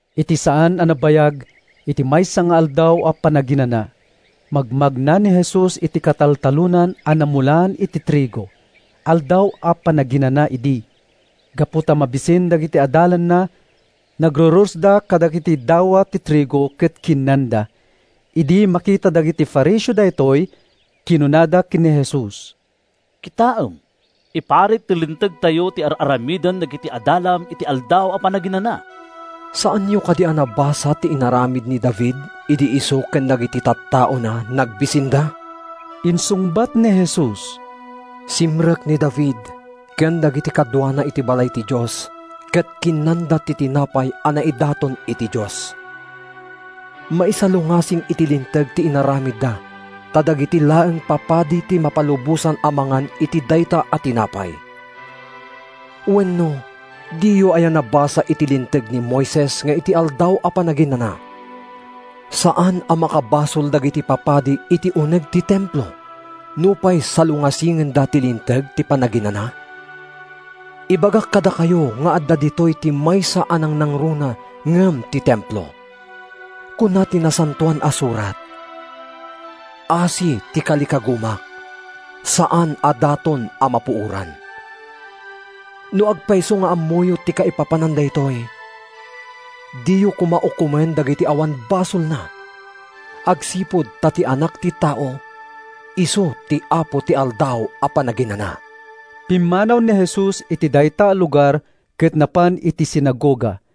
Iti saan a nabayag, iti maysa nga Aldaw a Panaginana, magmagna ni Jesus iti kataltalonan a namulaan iti trigo. Aldaw a Panaginana idi. Gapu ta mabisin dagiti adalanna, nagrurosda kadagiti dawa ti trigo ket kinnanda. Idi makita dagiti Fariseo daytoy, kinunada ken ni Jesus, “Kitaem, iparit ti Lintegtayo ti ar-aramiden dagiti adalam iti Aldaw a Panaginana.” “Saanyo kadi a nabasa ti inaramid ni David idi isu ken dagiti tattaona nagbisinda?” insungbat ni Jesus. “Simrek ni David ken dagiti kaduana iti balay ti Dios ket kinnanda ti tinapay a naidaton iti Dios. Maisalungasing iti linteg ti inaramidda ta dagiti laeng papadi ti mapalubosan a mangan iti dayta a tinapay. Wenno diyo aya nabasa iti Linteg ni Moises nga iti Aldaw a Panaginana saan a makabasol dagiti papadi iti uneg ti Templo nupay salungasingenda ti Linteg ti Panaginana? Ibagak kadakayo nga adda ditoy ti maysa a nangnangruna ngem ti Templo. Kuna ti Nasantoan a Surat, ‘Asi ti kalikagumak—saan a daton a mapuoran.’ No agpayso nga ammoyo ti kaipapanan daytoy, diyo koma ukomen dagiti awan basolna agsipud ta ti Anak ti Tao isu ti Apo ti Aldaw a Panaginana.” Pimmanaw ni Jesus iti dayta a lugar ket napan iti sinagoga.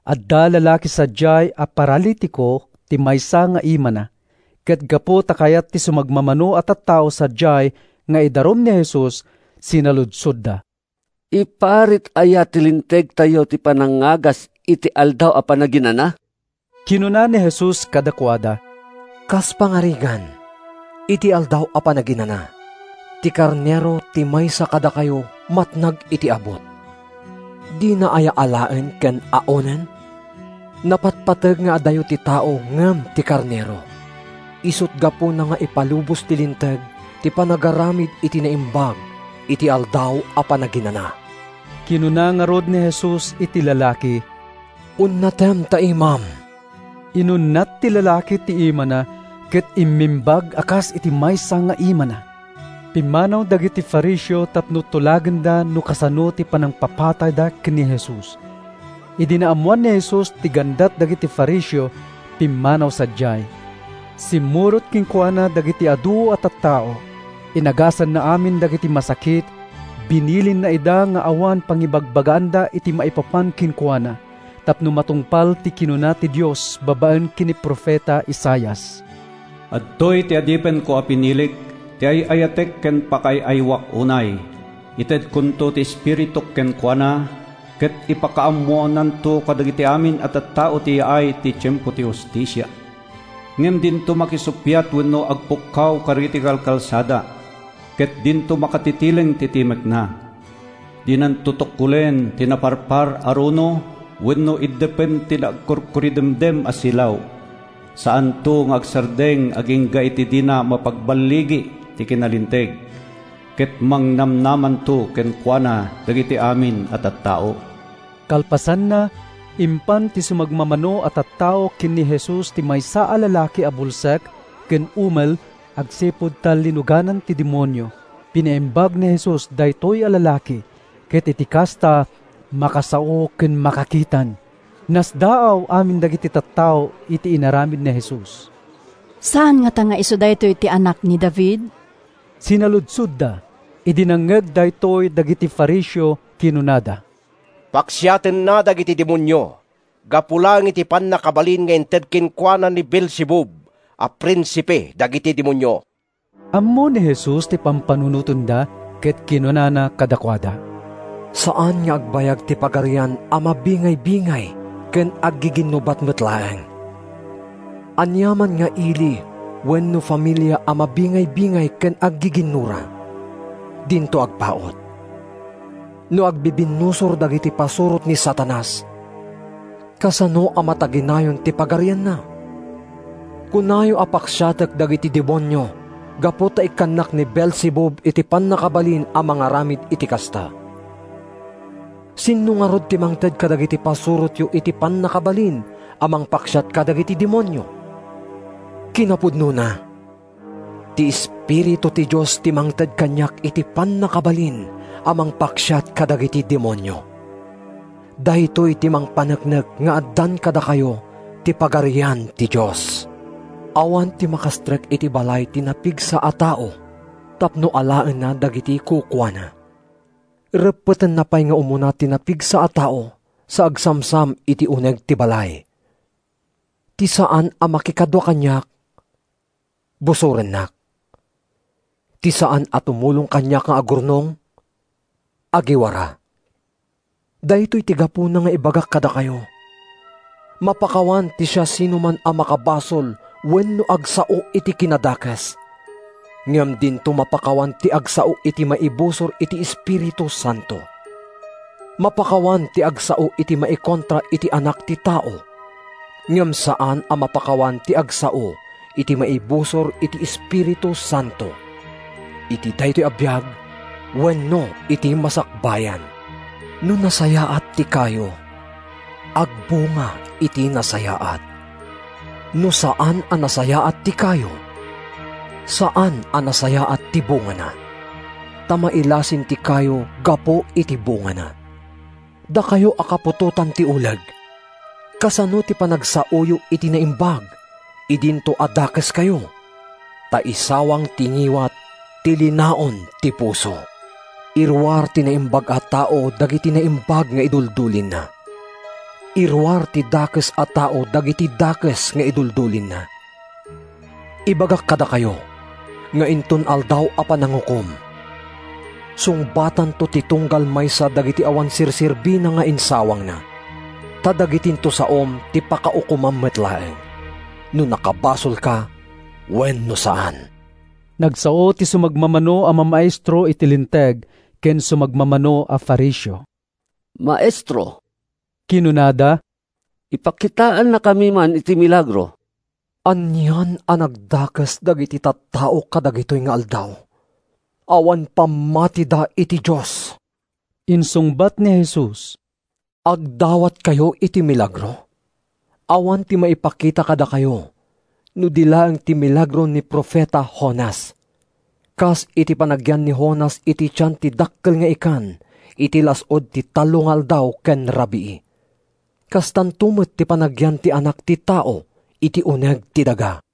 Adda lalaki sadiay a paralitiko ti maysa nga imana. Ket gapu ta kayat ti sumagmamano a tattao sadiay nga idarum ni Jesus, sinaludsodda, “Iparit aya ti Lintegtayo ti panangagas iti Aldaw a Panaginana?” Kinuna ni Jesus kadakuada, “Kas pangarigan, iti Aldaw a Panaginana, ti karnero ti maysa kadakayo matnag iti abut, dina aya alaen ken aonen? Napatpateg nga adayo ti tao ngem ti karnero! Isut’ gapuna nga ipalubos ti Linteg ti panagaramid iti naimbag iti Aldaw a Panaginana.” Kinuna ngarud ni Jesus iti lalaki, “Unnatem ta imam.” Inunnat ti lalaki ti imana ket immimbag a kas iti maysa nga imana. Pimmanaw dagiti Fariseo tapno tulagenda no kasano ti panangpapatayda ken ni Jesus. Idi naammoan ni Jesus ti gandat dagiti Fariseo, pimmanaw sadiay. Simmurot kenkuana dagiti adu a tattao. Inagasanna amin dagiti masakit. Binilinna ida nga awan pangibagbagaanda iti maipapan kenkuana tapno matungpal ti kinuna ti Dios babaen ken ni profeta Isaias: “Adtoy ti adipenko a pinilik, Ti ay-ayatek ken pakaay-ayoak unay. Itedkonto ti Espirituk kenkuana, Ket ipakaammonanto kadagiti amin a tattao ti yaay ti tiempo ti hustisia. Ngem dinto makisuppiat wenno agpukkaw kadagiti kalkalsada; Ket dinto makatitileng ti timekna. Dinanto tukkolen ti naparpar a runo, Wenno iddepen ti agkurkuridemdem a silaw. Saanto nga agsardeng agingga iti dina mapagballigi ti kinalinteg; Ket mangnamnamanto kenkuana dagiti amin a tattao.” Kalpasanna, impan ti sumagmamano a tattao ken ni Jesus ti maysa a lalaki a bulsek ken umel agsipud ta linuganan ti demonio. Pinaimbag ni Jesus daytoy a lalaki, ket iti kasta, makasao ken makakitan. Nasdaaw amin dagiti tattao iti inaramid ni Jesus. “Saan ngata nga isu daytoy ti Anak ni David?” sinaludsodda. Idi nangngeg daytoy dagiti Fariseo kinunada, “Paksiatenna dagiti demonio gapu laeng iti pannakabalin nga inted kenkuana ni Beelzebub a prinsipe dagiti demonio.” Ammo ni Jesus ti pampanunotenda ket kinunana kadakuada, “Saan nga agbayag ti pagarian a mabingaybingay ken aggiginnubat met laeng. Aniaman nga ili wenno familia a mabingaybingay ken aggiginnura, dinto agpaut. No agbibinnusor dagiti pasurot ni Satanas, kasano a mataginayon ti pagarianna? Kunayo a paksiatek dagiti demonio gapu ta ikkannak ni Beelzebub iti pannakabalin a mangaramid iti kasta. Sinno ngarud ti mangted kadagiti pasurotyo iti pannakabalin a mangpaksiat kadagiti demonio? Kinapudnona, ti Espiritu ti Dios ti mangted kaniak iti pannakabalin a mangpaksiat kadagiti demonio. Daytoy ti mangpaneknek nga addan kadakayo ti Pagarian ti Dios. “Awan ti makastrek iti balay ti napigsa a tao tapno alaenna dagiti kukuana. Reppetenna pay nga umuna ti napigsa a tao sa agsamsam iti uneg ti balay. “Ti saan a makikadua kaniak, busorennak. Ti saan a tumulong kaniak nga agurnong, agiwara. Daytoy ti gapuna nga ibagak kadakayo: mapakawan ti siasinoman a makabasol wenno agsao iti kinadakes, ngem dinto mapakawan ti agsao iti maibusor iti Espiritu Santo. Mapakawan ti agsao iti maikontra iti Anak ti Tao, ngem saan a mapakawan ti agsao iti maibusor iti Espiritu Santo—iti daytoy a biag wenno iti masakbayan.” “No nasayaat ti kayo, agbunga iti nasayaat. No saan a nasayaat ti kayo, saan a nasayaat ti bungana. Ta mailasin ti kayo gapu iti bungana. Dakayo a kaputotan ti uleg, kasano ti panagsaoyo iti naimbag idinto a dakeskayo? Ta isawang ti ngiwat ti linaon ti puso. Iruar ti naimbag a tao dagiti naimbag nga iduldulinna. Iruar ti dakes a tao dagiti dakes nga iduldulinna. “Ibagak kadakayo nga inton Aldaw a Panangukom, sungbatanto ti tunggal maysa dagiti awan serserbina nga insawangna. Ta dagitinto saom ti pakaukomam met laeng—no nakabasolka wenno saan.” Nagsao ti sumagmamano a mamaestro iti Linteg ken sumagmamano a Fariseo. “Maestro,” kinunada, “ipakitaannakami man iti milagro.” “Anian a nagdakes dagiti tattao kadagitoy nga aldaw! Awan pammatida iti Dios,” insungbat ni Jesus. “Agdawatkayo iti milagro? Awan ti maipakita kadakayo no di laeng ti milagro ni profeta Jonas. Kas iti panagyan ni Jonas iti tian ti dakkel nga ikan iti las-ud ti tallo nga aldaw ken rabii, kastanto met ti panagyan ti Anak ti Tao iti uneg ti daga.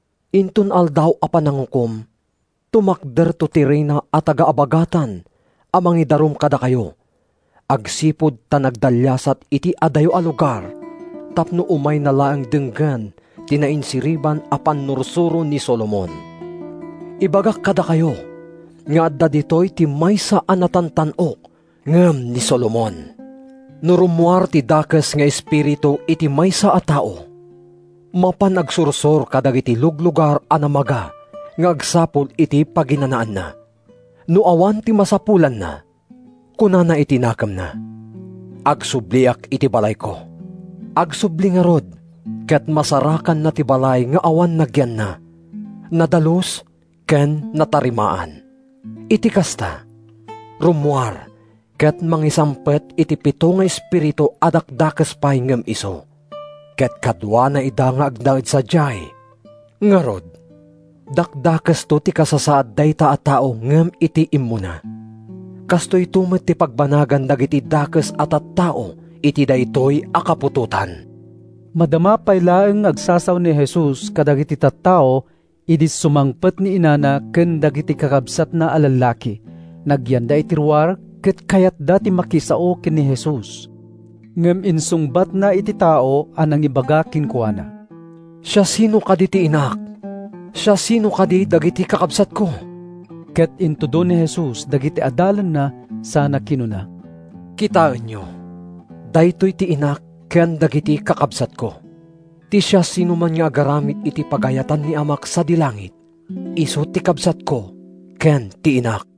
Inton Aldaw a Panangukom, tumakderto ti Reyna a taga-Abagatan a mangidarum kadakayo agsipud ta nagdalliasat iti adayo a lugar tapno umayna laeng denggen ti nainsiriban a pannursuro ni Solomon. Ibagak kadakayo nga adda ditoy ti maysa a natantan-ok ngem ni Solomon.” “No rummuar ti dakes nga espiritu iti maysa a tao, mapan agsursor kadagiti luglugar a namaga nga agsapul iti paginanaanna. No awan ti masapulanna, kunana iti nakemna, ‘Agsubliak iti balayko.’ Agsubli ngarud ket masarakanna ti balay nga awan nagyanna, nadalus ken natarimaan. Iti kasta, rummuar ket mangisangpet iti pito nga espiritu a dakdakes pay ngem isu, ket kaduana ida nga agnaed sadiay. Ngarud, dakdakesto ti kasasaad dayta a tao ngem iti immuna. Kastoyto met ti pagbanagan dagiti dakes a tattao iti daytoy a kaputotan.” Madama pay laeng nga agsasao ni Jesus kadagiti tattao idi sumangpet ni inana ken dagiti kakabsatna a lallaki. Nagyanda iti ruar ket kayatda ti makisao ken ni Jesus. Ngem insungbatna iti tao a nangibaga kenkuana, “Siasino kadi ti inak? Siasino kadi dagiti kakabsatko?” Ket intudo ni Jesus dagiti adalanna sana kinuna, “Kitaenyo! Daytoy ti inak ken dagiti kakabsatko! Ti siasinoman nga agaramid iti pagayatan ni Amak sadi langit, isu ti kabsatko ken ti inak.”